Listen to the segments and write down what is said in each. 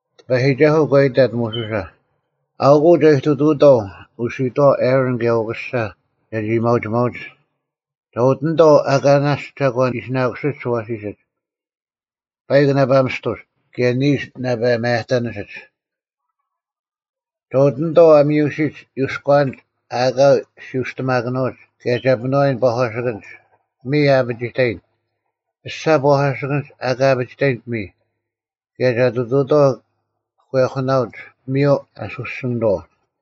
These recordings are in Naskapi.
ᑎᐸᔨᒋᒐᓱᐤ ᒂ ᐃᑕᑦ ᒧᓱᓴ, “ᐊᐅᑯᐤ ᒐ ᐃᑐᑐᐅᑥᐤ ᐅᓯᔨᑥᐛ ᐊᕋᓐ ᑭᔭ ᐅᑯᓴ ᒐᒋ ᐊᔭᒥᐊᐅᒋᒪᐅᒡ, ᒐ ᐅᑎᓂᑥᐤ ᐊᑲ ᓇᔅᒡ ᒐᒂᓐ ᐃᓯᓇᑯᓯᒡ ᐊᐛᓯᓯᒡ: ᐸᐃᒄ ᓇᐸ ᒥᔅᑐᔅ ᑭᔭ ᓂᓱ ᓇᐸ ᒪᔭᑕᓂᓯᒡ᙮ ᒐ ᐅᑎᓂᑥᐤ ᐊ ᒥᔪᓯᒡ ᔪᔎᐛᓂᒡ ᐊ ᐊᑲ ᓯᐅᔅᑎᒪᑭᓄᐅᒡ ᑭᔭ ᒐ ᐱᒥᓄᐛᔨᓐ ᐸᒂᓯᑭᓐᒡ: ᐱᒥᔾ ᐊ ᐊᐱᒋᑕᔨᓐ, ᐱᔅᒐ ᐸᒂᓯᑭᓐᒡ ᐊ ᐊᑲ ᐊᐱᒋᑕᔨᓐ ᐱᒥᔾ, ᑭᔭ ᒐ ᑐᑐᐅᑥᐤ ᒂᔨᐧᑯᓇᐅᒡ ᐱᒥᔪᐤ ᐊᓱᓯᓂᑥᐤ᙮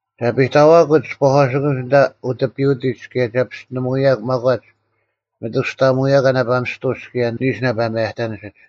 ᒐ ᐱᑕᐛᑯᒡ ᐸᒂᓯᑭᓐᒡ ᐊᓐᑕ ᐅᑎᐱᐅᑎᒡ ᑭᔭ ᒐ ᐱᔅᑎᓂᒧᐅᔭᒄ ᒪᒂᒡ ᒥᑐᔅᑕᐊᒪᒐᔭᒂ ᓇᐸ ᒥᔅᑐᔅ ᑭᔭ ᓂᓱ ᓇᐸ ᒪᔭᑕᓂᓯᒡ᙮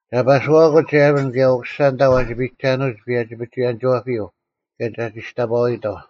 ᒐ ᐸᓱᐛᑯᒡ ᐊᕋᓐ ᑭᔭ ᐅᑯᓴ ᐊᓐᑕ ᐛᒋ ᐱᒐᓄᐎᒡ ᐸᔭᒋ-ᐱᒍᐎᔭᓂᒋᐛᐱᔪᐤ ᑭᔭ ᒐ ᒋᔅᑕᐸᐎᑥᐤ᙮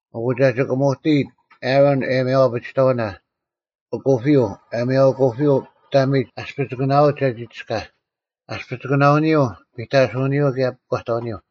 ᐊᑯ ᒐ ᒋᑭᒧᑎᔨᑦ ᐊᕋᓐ ᐊᔭᒥᐊᐤ ᐊᐱᒋᑕᐅᓇ: ᐊᑯᐱᔪᐤ, ᐊᔭᒥᐊᐤ ᐊᑯᐱᔪᐤ ᑕᒥᒡ ᐊᔅᐱᒋᑯᓇᐅᓂᒡ ᒐ ᒋᔅᑲᐧᒃ, ᐊᔅᐱᒋᑯᓇᐅᓂᔪᐤ, ᐱᑕᓱᐅᓂᔪᐤ, ᑭᔭ ᐱᒂᑕᐅᓂᔪᐤ᙮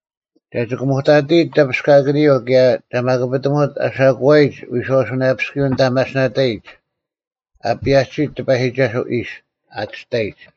ᒐ ᒋᑭᒧᑕᑎᔨᑦ ᑕᐱᔅᑲᑭᓂᔪᐤ ᑭᔭ ᒐ ᒪᑯᐱᑎᒧᑦ ᐊᓴᑯᐛᔨᒡ ᐎᔄᐅᓱᓇᔭᐱᔅᑯᔪᐤ ᐊᓐᑕ ᒪᓯᓇᑕᔨᒡ ‘ᐊ ᐸᔭᒋᓯᑦ ᑎᐸᔨᒋᒐᓱᐛ ᐃᔅ,’ ᐊᑎᔅᑕᔨᒡ᙮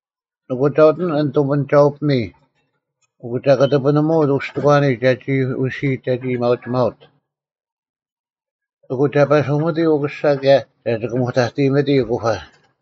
ᐊᑯ ᒐ ᐅᑎᓂᑦ ᐊᓐ ᑐᒥᓂᒐᐅ-ᐱᒥᔾ ᐊᑯ ᒐ ᑯᑎᐱᓂᒧᐅᑦ ᐅᔅᑎᒂᓂᒡ ᒐᒋ ᐅᓯᐃᑦ ᒐᒋ ᐊᔭᒥᐊᐅᒋᒪᐅᑦ᙮ ᐊᑯ ᒐ ᐸᓱᒥᑎ ᐅᑯᓴ ᑭᔭ ᒐ ᒋᑭᒧᑕᑎᔨᒥᑎᔾ ᐊᑯᐸ᙮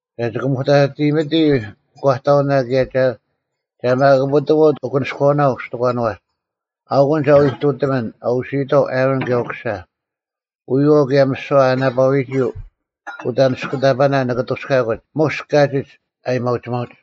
ᒐ ᒋᑭᒧᑕᑎᔨᒥᑎᔾ ᐱᒂᑕᐅᓇ ᑭᔭ ᒐ ᒪᑯᐱᑎᒧᑦ ᐊᑯᓂᔎᐅᓇ ᐅᔅᑎᒂᓄᐛᒡ᙮ ᐊᐅᑯᓐ ᒐ ᐎ ᐃᑐᑎᒥᓐ ᐊ ᐅᓯᔨᑥᐤ ᐊᕋᓐ ᑭᔭ ᐅᑯᓴ᙮ ᐎᔨᐛᐤ ᑭᔭ ᒥᓯᐛ ᐊ ᓇᐸᐎᒋ ᐅᑦ ᐊᓂᔅᑯᑕᐸᓄᐛᐛ ᓂᑭ ᐊᑐᔅᑲᑯᒡ ᒧᔅ ᑲᒋᒡ ᐊᔭᒥᐊᐅᒋᒪᐅᒡ᙮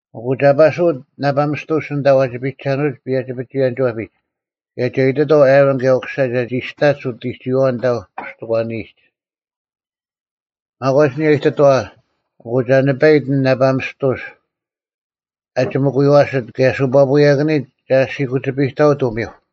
ᐊᑯ ᒐ ᐸᓱᐅᑦ ᓇᐸ ᒥᔅᑐᔅ ᐊᓐᑕ ᐛᒋ ᐱᒐᓄᐅᒡ ᐸᔭᒋ-ᐱᒍᐎᔭᓂᒋᐛᐱᒡ ᑭᔭ ᒐ ᐃᑎᑥᐤ ᐊᕋᓐ ᑭᔭ ᐅᑯᓴ ᒐᒋ ᐊᔅᑕᒡ ᐅᑎᒋᐛᐛ ᐊᓐᑕ ᐅᔅᑎᒂᓂᔨᒡ᙮ ᒪᒂᒡ ᐊᓂᔭ ᐃᑎᑥᐛ, ᐊᑯ ᒐ ᓂᐸᐃᑦ ᐊᓐ ᓇᐸ ᒥᔅᑐᔅ ᐊ ᒋᒥᑯᔪᐛᓯᑦ ᑭᔭ ᓱᐸᐳᔭᑭᓂᒡ ᒐ ᓯᑯᐸᒋᐱᔨᑕᐅᑦ ᐅᒥᐧᒄ᙮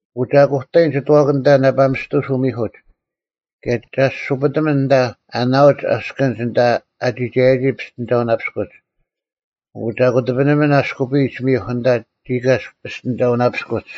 ᐊᑯ ᒐ ᑯᑕᔨᓐ ᒋᑐᐛᑭᓐ ᐊᓐᑕ ᓇᐸ ᒥᔅᑐᔅ ᐅᒥᐧᑯᒡ ᑭᔭ ᒐ ᐊᓯᐳᑎᒥᓐ ᐊᓐᑕ ᐊ ᓇᐅᒡ ᐊᔅᑭᓐᒡ ᐊᓐᑕ ᐊ ᒋᒐᔭᒋ ᐱᔅᑎᓂᒐᐅᓇᐱᔅᑯᒡ᙮ ᐊᑯ ᒐ ᑯᑎᐱᓂᒥᓐ ᐊᔅᑯᐱᔨᒡ ᒥᐧᒄ ᐊᓐᑕ ᒋᑲᔅᒄ ᐱᔅᑎᓂᒐᐅᓇᐱᔅᑯᒡ᙮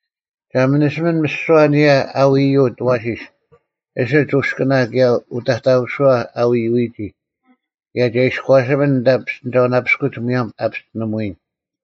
ᒐ ᒥᓂᓯᒥᓐ ᒥᓯᐛ ᐊᓂᔭ ᐊ ᐎᔪᐅᑦ ᐊᐛᓯᔅ ᐊᓯᒡ ᐅᔅᑯᓇ ᑭᔭ ᐅᑕᑕᐧᑯᓱᐛ ᐊ ᐎᔪᐎᒋ ᑭᔭ ᒐ ᐃᔎᓱᒥᓐ ᐊᓐᑕ ᐱᔅᑎᓂᒐᐅᓇᐱᔅᑯᒡ ᒧᔭᒻ ᐊ ᐱᔅᑎᓂᒧᐎᓐ᙮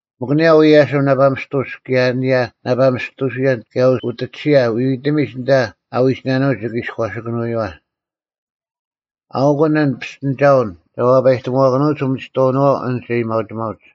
ᒥᒄ ᐊᓂᔭ ᐅᐎᔭᓯᒻ ᓇᐸ ᒥᔅᑐᔅ ᑭᔭ ᐊᓂᔭ ᓇᐸ ᒥᔅᑐᓱᔭᓐ ᑭᔭ ᐅᑎᒋᓯᔭ ᐎᐎᑎᒥᒡ ᐊᓐᑕ ᐊ ᐎᒋᓇᓄᒡ ᒋᑭ ᐃᔎᓴᑭᓂᔪᐛ᙮ ᐊᐅᑯᓐ ᐊᓐ ᐱᔅᑎᓂᒐᐅᓐ ᒐ ᐛᐸᔨᑎᒧᐛᑭᓄᐅᒡ ᐅᒥᒋᑥᐅᓄᐛᐛ ᐊᓐᒡ ᐊᔭᒥᐊᐅᒋᒪᐅᒡ᙮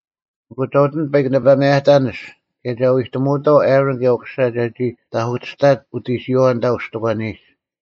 ᐊᑯ ᒐ ᐅᑎᓂᑦ ᐸᐃᒄ ᓇᐸ ᒪᔭᑕᓂᔅ ᑭᔭ ᒐ ᐎᑎᒧᐅᑥᐤ ᐊᕋᓐ ᑭᔭ ᐅᑯᓴ ᒐᒋ ᑕᐧᑯᑎᔅᑕᒡ ᐅᑎᒋᔨᐛᐛ ᐊᓐᑕ ᐅᔅᑎᒂᓂᔨᒡ᙮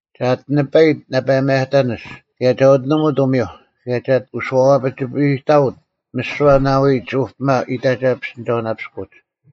ᒐ ᐊᑎ ᓂᐸᐃᑦ ᓇᐸ ᒪᔭᑕᓂᔅ ᑭᔭ ᒐ ᐅᑎᒧᑦ ᐅᒥᐧᒄ ᑭᔭ ᒐ ᐊᑎ ᐅᔄᐸᒋᐱᔨᑕᐅᑦ ᒥᓯᐛ ᓇᐎᒡ ᐅᐱᒪ ᐃᑕᒐ ᐱᔅᑎᓂᒐᐅᓇᐱᔅᑯᒡ᙮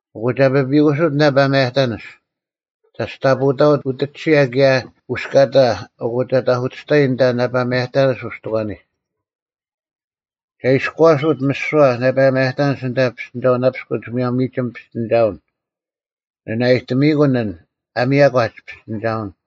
ᐊᑯ ᒐ ᐱᐱᑯᓱᑦ ᐊᓐ ᓇᐸ ᒪᔭᑕᓂᔅ, ᒐᔅᑕᐳᑕᐅᑦ ᐅᑎᒋᓯᔭ ᑭᔭ ᐅᔅᑲᑕ ᐊᑯ ᒐ ᑕᐧᑯᑎᔅᑕᔨᓐ ᐊᓐᑕ ᓇᐸ ᒪᔭᑕᓂᔅ ᐅᔅᑎᒂᓂᒡ᙮ ᒐ ᐃᔎᓱᑦ ᒥᓯᐛ ᓇᐸ ᒪᔭᑕᓂᔅ ᐊᓐᑕ ᐱᔅᑎᓂᒐᐅᓇᐱᔅᑯᒡ ᒧᔭᒻ ᒥᒋᒻ ᐱᔅᑎᓂᒐᐅᓐ᙮ ᓂ ᓇᐊᔨᑎᒥᔨᑯᓐ ᐊᓐ ᐊ ᒥᔭᒂᒡ ᐱᔅᑎᓂᒐᐅᓐ᙮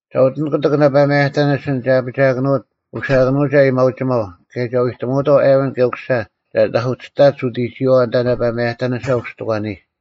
ᒐ ᐅᑎᓂᑦ ᑯᑎᒃ ᓇᐸ ᒪᔭᑕᓂᔅ ᐊᓐ ᒐ ᐊᐱᒋᐊᑭᓄᐅᑦ ᐅᓯᐊᑭᓄᐅᒐ ᐊᔭᒥᐊᐅᒋᒪᐤ ᑭᔭ ᒐ ᐎᑎᒧᐅᑥᐤ ᐊᕋᓐ ᑭᔭ ᐅᑯᓴ ᒐ ᑕᐧᑯᑎᔅᑕᒡ ᐅᑎᒋᔨᐛᐛ ᐊᓐᑕ ᓇᐸ ᒪᔭᑕᓂᓴ ᐅᔅᑎᒂᓂᔨᒡ᙮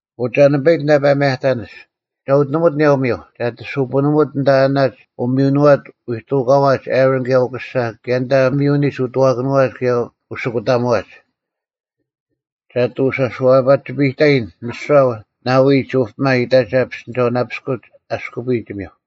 ᐊᑯ ᒐ ᓂᐸᐃᑦ ᐊᓐ ᓇᐸ ᒪᔭᑕᓂᔅ, ᒐ ᐊᑎ ᐅᑎᓂᒧᑦ ᐊᓂᔭ ᐅᒥᐧᒄ ᒐ ᐊᑎ ᓱᐳᓂᒧᑦ ᐊᓐᑕ ᐊᓇᒡ ᐅᒥᔪᓄᐛᒡ ᐎᑐᑲᐛᒡ ᐊᕋᓐ ᑭᔭ ᐅᑯᓴ ᑭᔭ ᐊᓐᑕ ᒥᔪᓂᒡ ᐅᑐᐛᑭᓄᐛᒡ ᑭᔭ ᐅᓯᑯᑕᒧᐛᒡ᙮ ᒐ ᐊᑎ ᐅᔄᐸᒋᐱᔨᑕᔨᓐ ᒥᓯᐛ ᓇᐎᒡ ᐅᐱᒪ ᐃᑕᒐ ᐱᔅᑎᓂᒐᐅᓇᐱᔅᑯᒡ ᐊᔅᑯᐱᔨᒡ ᒥᐧᒄ᙮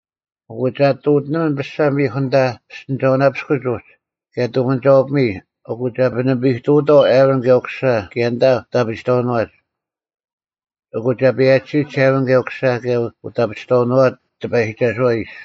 ᐊᑯ ᒐ ᐊᑎ ᐅᑎᓂᒥᓐ ᐱᔅᒐ ᒥᐧᒄ ᐊᓐᑕ ᐱᔅᑎᓂᒐᐅᓇᐱᔅᑯᒡ ᐅᒡ ᑭᔭ ᑐᒥᓂᒐᐅ-ᐱᒥᔾ ᐊᑯ ᒐ ᐱᓂᐱᔨᑐᐅᑥᐤ ᐊᕈᓐ ᑭᔭ ᐅᑯᓴ ᑭᔭ ᐊᓐᑕ ᐅᑦ ᐊᐱᒋᑕᐅᓄᐛᒡ᙮ ᐊᑯ ᒐ ᐸᔭᒋᓯᒡ ᐊᕈᓐ ᑭᔭ ᐅᑯᓴ ᑭᔭ ᐅᑦ ᐊᐱᒋᑕᐅᓄᐛᐛ ᑎᐸᔨᒋᒐᓱᐛ ᐃᔅ᙮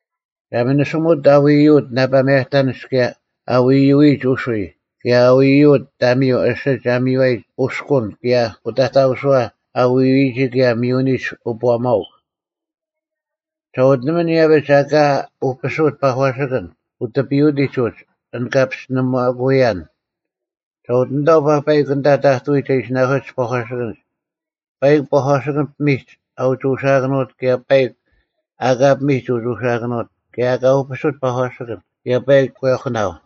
ᒐ ᒥᓂᓯᒧᑦ ᐊ ᐎᔪᐅᑦ ᓇᐸ ᒪᔭᑕᓂᔅ ᑭᔭ ᐊ ᐎᔪᐎᔨᒡ ᐅᓱᔾ ᑭᔭ ᐊ ᐎᔪᐅᑦ ᑕᒥᔪᐤ ᐊᓯᒡ ᐊ ᒥᔽᔨᒡ ᐅᔅᑯᓐ ᑭᔭ ᐅᑕᑕᐧᑯᓱᐛ ᐊ ᐎᔪᐎᒋ ᑭᔭ ᒥᔪᓂᒡ ᐅᑈᒪᐅᒄ᙮ ᒐ ᐅᑎᓂᑦ ᐃᔭᐱᒡ ᐊᑲ ᐅᐱᓱᑦ ᐸᒂᓯᑭᓐ ᐅᑎᐱᐅᑎᒡ ᐅᒡ ᐊᓐ ᑲ ᐱᔅᑎᓂᒪᑯᐎᔭᓐ, ᒐ ᐅᑎᓂᑥᐤ ᐸᐸᐃᒄ ᐊᓐ ᑕᑐᐎᒡ ᐊ ᐃᓯᓇᑯᓯᒡ ᐸᒂᓯᑭᓐᒡ, ᐸᐃᒄ ᐸᒂᓯᑭᓐ ᐱᒥᒡ ᐊ ᐅᒋ ᐅᓯᐊᑭᓄᐅᑦ ᑭᔭ ᐸᐃᒄ ᐊᑲ ᐱᒥᒡ ᐅᒋ ᐅᓯᐊᑭᓄᐅᑦ ᑭᔭ ᐊ ᐊᑲ ᐅᐱᓱᑦ ᐸᒂᓯᑭᓐ ᑭᔭ ᐸᐃᒄ ᒂᔨᐧᑯᓇᐤ᙮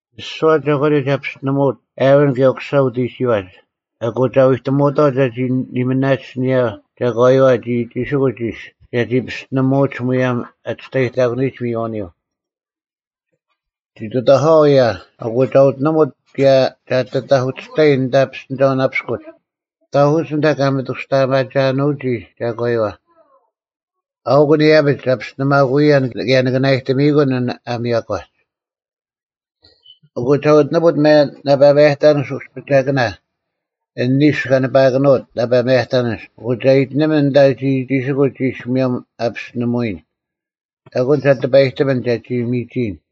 ᒥᓯᐛ ᒐᒂᓂᔪᐤ ᒐ ᐱᔅᑎᓂᒧᑦ ᐊᕋᓐ ᑭᔭ ᐅᑯᓴ ᐅᑎᒋᐛᒡ ᐊᑯ ᒐ ᐎᑎᒧᐅᑥᐤ ᒐᒋ ᓂᒥᓇᒡ ᐊᓂᔭ ᒐᒂᔪᐛ ᒋᒋᒋᓯᑯᒡ ᐃᔅ ᒐᒋ ᐱᔅᑎᓂᒧᐅᒡ ᒧᔭᒻ ᐊ ᒋᔅᑕᔨᑯᓂᔨᒡ ᒥᔨᐛᐅᓂᔪᐤ᙮ ᒋ ᑐᑕᐧᑲᐛ ᐅᔭ ᐊᑯ ᒐ ᐅᑎᓂᒧᑦ ᑭᔭ ᒐ ᐊᑎ ᑕᐧᑯᑎᔅᑕᔨᓐ ᐊᓐᑕ ᐱᔅᑎᓂᒐᐅᓇᐱᔅᑯᒡ, ᑕᐧᑯᒡ ᐊᓐᑕ ᑲ ᒥᑐᔅᑕᐊᒪᒐᓄᒋ ᒐᒂᔪᐛ᙮ ᐊᐅᑯᓐ ᐃᔭᐱᒡ ᒐ ᐱᔅᑎᓂᒪᑯᐅᔭᓐ ᑭᔭ ᓂᑭ ᓇᐊᔨᑎᒥᔨᑯᓐ ᐊᓐ ᐊ ᒥᔭᒂᒡ᙮ ᐊᑯ ᒐ ᐅᑎᓂᒧᑦ ᓇᐸ ᒪᔭᑕᓂᔅ ᐅᔅᐱᒐᑭᓇ ᐊᓐ ᓂᓱ ᑲ ᓂᐸᐊᑭᓄᐅᑦ ᓇᐸ ᒪᔭᑕᓂᔅ ᐊᑯ ᒐ ᐃᑎᓂᒥᓐ ᐊᓐᑕ ᒋᒋᒋᓯᑯᒡ ᐃᔅ ᒧᔭᒻ ᐊ ᐱᔅᑎᓂᒧᐎᔨᓐ᙮ ᐊᐅᑯᓐ ᒐ ᑎᐸᔨᑎᒥᓐ ᒐᒋ ᒥᒋᔨᓐ᙮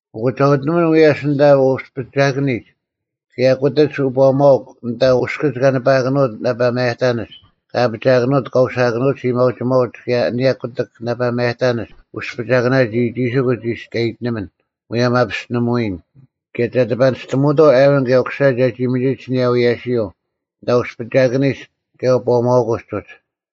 ᐊᑯ ᒐ ᐅᑎᓂᒥᓐ ᐎᔭᔅ ᐊᓐᑕ ᐅᔅᐱᒐᑭᓂᒡ, ᑭᔭ ᑯᑎᒡ ᐅᑈᒪᐅᒄ ᐊᓐᑕ ᐅᔅᑭᒡ ᑲ ᓂᐸᐊᑭᓄᑦ ᓇᐸ ᒪᔭᑕᓂᔅ ᑲ ᐊᐱᒋᐊᑭᓄᐅᑦ ᑲ ᐅᓯᐊᑭᓄᐅᒡ ᐊᔭᒥᐊᐅᒋᒪᐅᒡ ᑭᔭ ᐊᓂᔭ ᑯᑎᒃ ᓇᐸ ᒪᔭᑕᓂᔅ ᐅᔅᐱᒐᑭᓇ ᒋᒋᒋᓯᑯᒡ ᐃᔅ ᑲ ᐃᑎᓂᒥᓐ ᒧᔭᒻ ᐊ ᐱᔅᑎᓂᒧᐎᔨᓐ ᑭᔭ ᒐ ᑎᐸᓂᔅᑎᒧᐅᑥᐤ ᐊᕋᓐ ᑭᔭ ᐅᑯᓴ ᒐᒋ ᒥᒋᒡ ᐊᓂᔭ ᐎᔭᓯᔪᐤ ᐊᓐᑕ ᐅᔅᐱᒐᑭᓂᒡ ᑭᔭ ᐅᑈᒪᐅᑯᔪᐤ ᐅᒡ᙮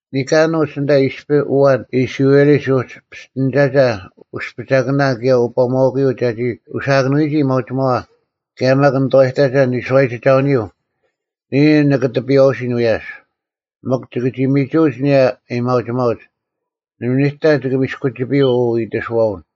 ᓂᑲᓄᒡ ᐊᓐᑕ ᐃᔅᐱ ᐊᐛᓐ ᐃᔅᕋᐃᓕᒡ ᐅᒡ ᐱᔅᑎᓂᒐᒐ ᐅᔅᐱᒐᑭᓇ ᑭᔭ ᐅᑈᒪᐅᑯᔪᐤ ᒐᒋ ᐅᓯᐊᑭᓄᐎᒋ ᐊᔭᒥᐊᐅᒋᒪᐛ ᑭᔭ ᒪᒃ ᓂᑐᐛᔨᑕᒐ ᓂᓱᐛᔨᒋᒐᐅᓂᔪᐤ, ᓂᔾ ᐊᓐ ᓂᑭ ᑎᐱᔨᐛᐅᓯᓐ ᐎᔭᔅ, ᒥᒄ ᒋᑭ ᒋ ᒥᒍᐅᒡ ᐊᓂᔭ ᐊᔭᒥᐊᐅᒋᒪᐅᒡ᙮ ᓇᒪ ᓂᑕ ᒋᑭ ᒥᔅᑯᒋᐱᔪᐤ ᐅ ᐃᑎᓱᐛᐅᓐ᙮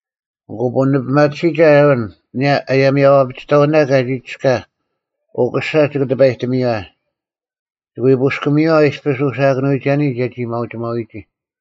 ᐊᑯ ᐳᓂᐱᒪᑎᓯᒐ ᐊᕋᓐ, ᐊᓂᔭ ᐊᔭᒥᐊᐅ-ᐊᐱᒋᑕᐅᓇ ᑲᒋ ᒋᔅᑲᐧᒃ, ᐅᑯᓴ ᒋᑭ ᑎᐸᔨᑎᒥᔨᐛ᙮ ᒋᑭ ᐎ ᐳᔅᑭᒥᔨᐛ ᐃᔅᐱ ᐅᓯᐊᑭᓄᐎᒐᓂ ᒐᒋ ᐊᔭᒥᐊᐅᒋᒪᐎᒋ᙮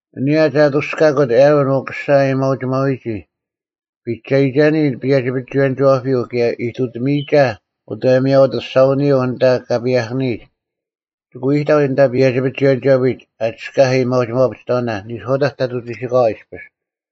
ᐊᓂᔭ ᒐ ᐅᔅᑕᔅᑯᑦ ᐊᕋᓐ ᐅᑯᓴ ᐊᔭᒥᐊᐅᒋᒪᐎᒋ ᐱᒐᔨᒐᓂ ᐸᔭᒋ ᐱᒍᐎᔭᓂᒋᐛᐱᔪᐤ ᑭᔭ ᐃᑐᑎᒥᔨᒐ ᐅᑦ ᐊᔭᒥᐊᐤ ᐊᑐᔅᒐᐅᓂᔪᐤ ᐊᓐᑕ ᑲ ᐸᔭᐧᑭᓂᔨᒡ, ᒋᑭ ᐎ ᐃᑕᐤ ᐊᓐᑕ ᐸᔭᒋ ᐱᒍᐎᔭᓂᒋᐛᐱᒡ, ᐊ ᒋᔅᑲᐧᒃ ᐊᔭᒥᐊᐅ-ᐊᐱᒋᑕᐅᓇ, ᓂᔄᐅᑕᒡ ᑕᑐᐤ ᒋᓯᑲᐛ ᐃᔅᐱᔅ᙮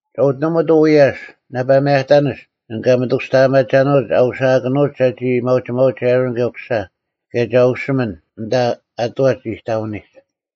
ᒐ ᐅᑎᓂᒧᑦ ᐅᐎᔭᔅ ᓇᐸ ᒪᔭᑕᓂᔅ ᐊᓐ ᑲ ᒥᑐᔅᑕᐊᒪᒐᓄᐅᒡ ᐊ ᐅᓯᐊᑭᓄᐅᒡ ᒐᒋ ᐊᔭᒥᐊᐅᒋᒪᐅᒡ ᐊᕈᓐ ᑭᔭ ᐅᑯᓴ ᑭᔭ ᒐ ᐅᓯᒥᓐ ᐊᓐᑕ ᐊᑐᐛᒡ ᐃᑕᐅᓂᒡ᙮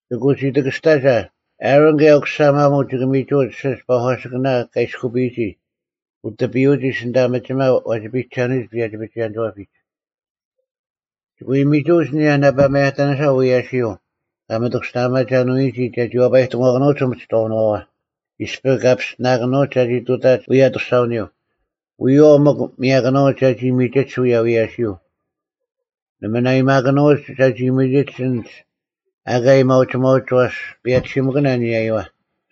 ᐊᑯ ᒋ ᑎᑭᔅᑕᔨᒐ, ᐊᕋᓐ ᑭᔭ ᐅᑯᓴ ᒪᒧᐤ ᒋᑭ ᒥᒍᐅᒡ ᐊᓯᒡ ᐸᒂᓯᑭᓇ ᑲ ᐃᔅᑯᐱᔨᒋ ᐅᑎᐱᔪᑎᒡ ᐊᓐᑕ ᒥᒋᒪ ᐛᒋ ᐱᔨᒐᓄᐎᒡ ᐸᔭᒋ ᐱᒍᐎᔭᓂᒋᐛᐱᒡ᙮ ᒋᑭ ᐎ ᒥᒍᐅᒡ ᐊᓂᔭ ᓇᐸ ᒪᔭᑕᓂᓴ ᐅᐎᔭᓯᔪᐤ ᑲ ᒥᑐᔅᑕᐊᒪᒐᓄᐎᔨᒋ ᒐᒋ ᐛᐸᔨᑎᒧᐛᑭᓄᐅᒡ ᐅᒥᒋᑥᐅᓄᐛᐛ ᐃᔅᐱ ᑲ ᐱᔅᑎᓇᑭᓄᐅᒡ ᒐᒋ ᑐᑕᒡ ᐅᔭ ᐊᑐᔅᒐᐅᐱᔪᐤ᙮ ᐎᔪᐛᐤ ᒥᒄ ᒥᔭᑭᓄᐅᒡ ᒐᒋ ᒥᒋᒡ ᐅᔭ ᐎᔭᓯᔪᐤ᙮ ᓇᒪ ᓇᐊᔨᒪᑭᓄᐅᒡ ᒐᒋ ᒥᒋᒡ ᐊᓐᒡ ᐊᑲ ᐊᔭᒥᐊᐅᒋᒪᐅᒡ ᐛᔅ ᐸᔭᒋᓯᒥᑭᓇ ᐊᓂᔭᔪᐛ᙮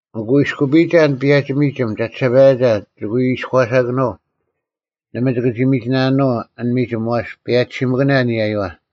ᐊᑯ ᐃᔅᑯᐱᔨᒐ ᐊᓐ ᐸᔭᒋ ᒥᒋᒻ ᒐᒋᓴᐸᔭᒐ ᒋᑭ ᐎ ᐃᔎᓴᑭᓄᐤ᙮ ᓇᒪ ᒋᑭ ᒋ ᒥᒋᓇᓄᐤ ᐊᓐ ᒥᒋᒻ ᐛᔅ ᐸᔭᒋᓯᒥᑭᓇ ᐊᓂᔭᔪᐛ᙮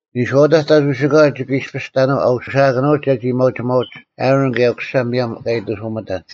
ᓂᔄᐅᑕᒡ ᑕᑐᐤ ᒋᓯᑲᐛ ᒋᑭ ᐃᔅᐱᔅ ᑕᓄᐤ ᐊ ᐅᓯᐊᑭᓄᐅᒡ ᒐᒋ ᐊᔭᒥᐊᐅᒋᒪᐅᒡ ᐊᕋᓐ ᑭᔭ ᐅᑯᓴ ᒧᔭᒻ ᑲ ᐃᑎᓱᒥᑕᓐ᙮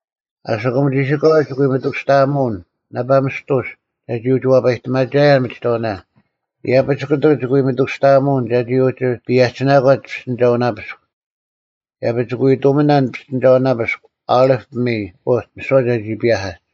ᐊᓯᑯᒻ ᒋᓯᑲᐛ ᒋᑭ ᐎ ᒥᑐᔅᑕᐊᒧᐅᓐ ᓇᐸ ᒥᔅᑐᔅ ᒐᒋ ᐅᒋ ᐛᐸᔨᑎᒪᒐᔭᓐ ᒥᒋᑥᐅᓇ᙮ ᐃᔭᐱᒡ ᑯᑎᒃ ᒋᑭ ᐎ ᒥᑐᔅᑕᐊᒧᐅᓐ ᒐᒋ ᐅᒋ ᐸᔭᒋᓇᒂᒡ ᐱᔅᑎᓂᒐᐅᓇᐱᔅᒄ᙮ ᐃᔭᐱᒡ ᒋᑭ ᐎ ᑐᒥᓇᓐ ᐱᔅᑎᓂᒐᐅᓇᐱᔅᒄ ᐅᓕᑉ ᐱᒥᔾ ᐅᒋ ᒥᓯᐛ ᒐᒋ ᐸᔭᐧᑲᒡ᙮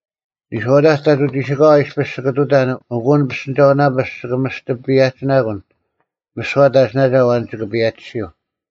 ᓂᔄᐅᑕᒡ ᑕᑐᐤ ᒋᓯᑲᐛ ᐃᔅᐱᔅ ᒋᑭ ᑐᑕᓐ ᐊᑯ ᐊᓐ ᐱᔅᑎᓂᒐᐅᓇᐱᔅᒄ ᒋᑭ ᒥᔅᑎ ᐸᔭᒋᓇᑯᓐ ᒥᓯᐛ ᑕᒋᓇᒐ ᐊᐛᓐ ᒋᑭ ᐸᔭᒋᓯᐤ᙮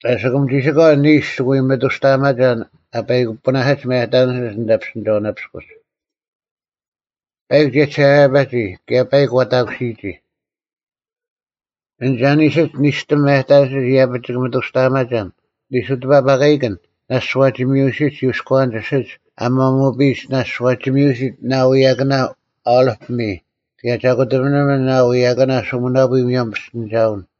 ᐊᓯᑯᒻ ᒋᓯᑲᐛ ᓂᓱ ᒋᑭ ᐎ ᒥᑐᔅᑕᐊᒪᒐᓐ ᐊ ᐸᐃᑯᐱᓇᓯᒡ ᒪᔭᑕᓂᓯᒡ ᐊᓐᑕ ᐱᔅᑎᓂᒐᐅᓇᐱᔅᑯᒡ᙮ ᐸᐃᒄ ᒋᔭᒋᓴᐸᔭᒋ ᑭᔭ ᐸᐃᒄ ᐛᑕᑯᓯᔨᒋ᙮ ᐊᓐ ᐊᓯᒡ ᓂᔅᑎᒻ ᒪᔭᑕᓂᔅ ᐃᔭᐱᒡ ᒋᑭ ᒥᑐᔅᑕᐊᒪᒐᓐ ᓂᓱ ᑎᐸᐸᑲᐃᑭᓐ ᓇᔅᒡ ᐛᒋ ᒥᔪᓯᒡ ᔪᔎᐛᓂᒡ ᐊᓯᒡ ᐊ ᒪᒧᐱᔨᒡ ᓇᔅᒡ ᐛᒋ ᒥᔪᓯᑦ ᓇᐤ ᐎᔭᑭᓇ ᐅᓕᑉ ᐱᒥᔾ ᑭᔭ ᒐ ᑯᑎᐱᓂᒥᓐ ᓇᐤ ᐎᔭᑭᓇ ᓱᒥᓇᐳᔾ ᒧᔭᒻ ᐱᔅᑎᓂᒐᐅᓐ᙮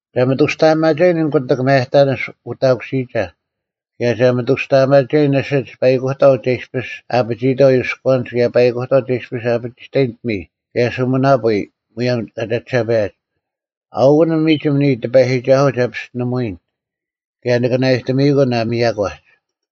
ᒐ ᒥᑐᔅᑕᐊᒪᒐᔨᓐ ᐊᓐ ᑯᑎᒃ ᒪᔭᑕᓂᔅ ᐅᑕᑯᓯᔨᒐ, ᑭᔭ ᒐ ᒥᑐᔅᑕᐊᒪᒐᔨᓐ ᐊᓯᒡ ᐸᐃᑯᑕᐤ ᒐ ᐃᔅᐱᔅ ᐊᐱᒋᐃᑥᐤ ᔪᔎᐛᓂᒡ ᑭᔭ ᐸᐃᑯᑕᐤ ᒐ ᐃᔅᐱᔅ ᐊᐱᒋᑕᔨᓐ ᐱᒥᔾ ᑭᔭ ᓱᒥᓇᐳᔾ ᒧᔭᒻ ᑲ ᒐᒋᓴᐸᔭᒡ᙮ ᐊᐅᑯᐤ ᒥᒋᒻ ᓂᔾ ᑎᐸᔨᒋᒐᓱᐤ ᒐ ᐱᔅᑎᓂᒧᐎᔨᓐ, ᑭᔭ ᓂᑭ ᓇᐊᔨᑎᒥᔨᑯᓐ ᐊ ᒥᔭᒂᒡ᙮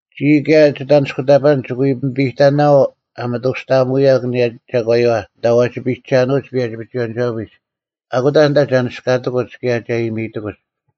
ᒋᔾ ᑭᔭ ᒋᑦ ᐊᓂᔅᑯᑕᐸᓐᒡ ᒋᑭ ᐎ ᐱᒥᐱᑕᓇᐛᐤ ᐊ ᒥᑐᔅᑕᐊᒧᐅᔭᒄ ᐊᓂᔭ ᒐᒂᔪᐛ ᐊᓐᑕ ᐛᒋ ᐱᔨᒐᓄᐅᒡ ᐸᔭᒋ ᐱᒍᐎᔭᓂᒋᐛᐱᒡ, ᐊᑯᑕ ᐊᓐᑕ ᒐ ᓂᒋᔅᑲᑎᑯᒡ ᑭᔭ ᒐ ᐃᔨᒥᑎᑯᒡ᙮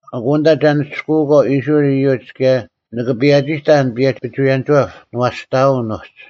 ᐊᑯᑕ ᐊᓐᑕ ᒐ ᓂᒋᔅᑯᐅᒂᐤ ᐃᔅᕋᐃᓪ ᐃᔪᒡ ᑭᔭ ᓂᑭ ᐸᔭᒋᑕᔭᓐ ᐸᔭᒋ ᐱᒍᐎᔭᓂᒋᐛᑉ ᓂᐛᔅᑕᐅᓐ ᐅᒡ᙮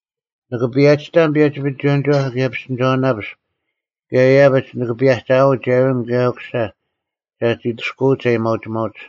ᓂᑭ ᐸᔭᒋᑕᓐ ᐸᔭᒋ ᐱᒍᐎᔭᓂᒋᐛᑉ ᑭᔭ ᐱᔅᑎᓂᒐᐅᓇᐱᔅᒄ ᑭᔭ ᐃᔭᐱᒡ ᓂᑭ ᐸᔭᒐᐅᒡ ᐊᕋᓐ ᑭᔭ ᐅᑯᓴ ᒐᒋ ᐊᑐᔅᑯᐅᒡ ᐊᔭᒥᐊᐅᒋᒪᐅᒡ᙮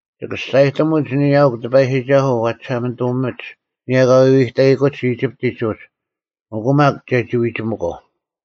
ᒋᑭ ᒋᔅᒐᔨᑎᒧᒡ ᓂᔾ ᐊᐅᒄ ᑎᐸᔨᒋᒐᓱᐤ ᐛ ᒋᓴᒪᓂᑐᒧᒥᒡ ᐊᓂᔭ ᑲ ᐎᐎᑕᐃᑯᒡ ᐃᒋᑉᑎᒡ ᐅᒡ, ᐊᑯ ᒪᒃ ᒐᒋ ᐎᒋᒥᒂᐤ᙮”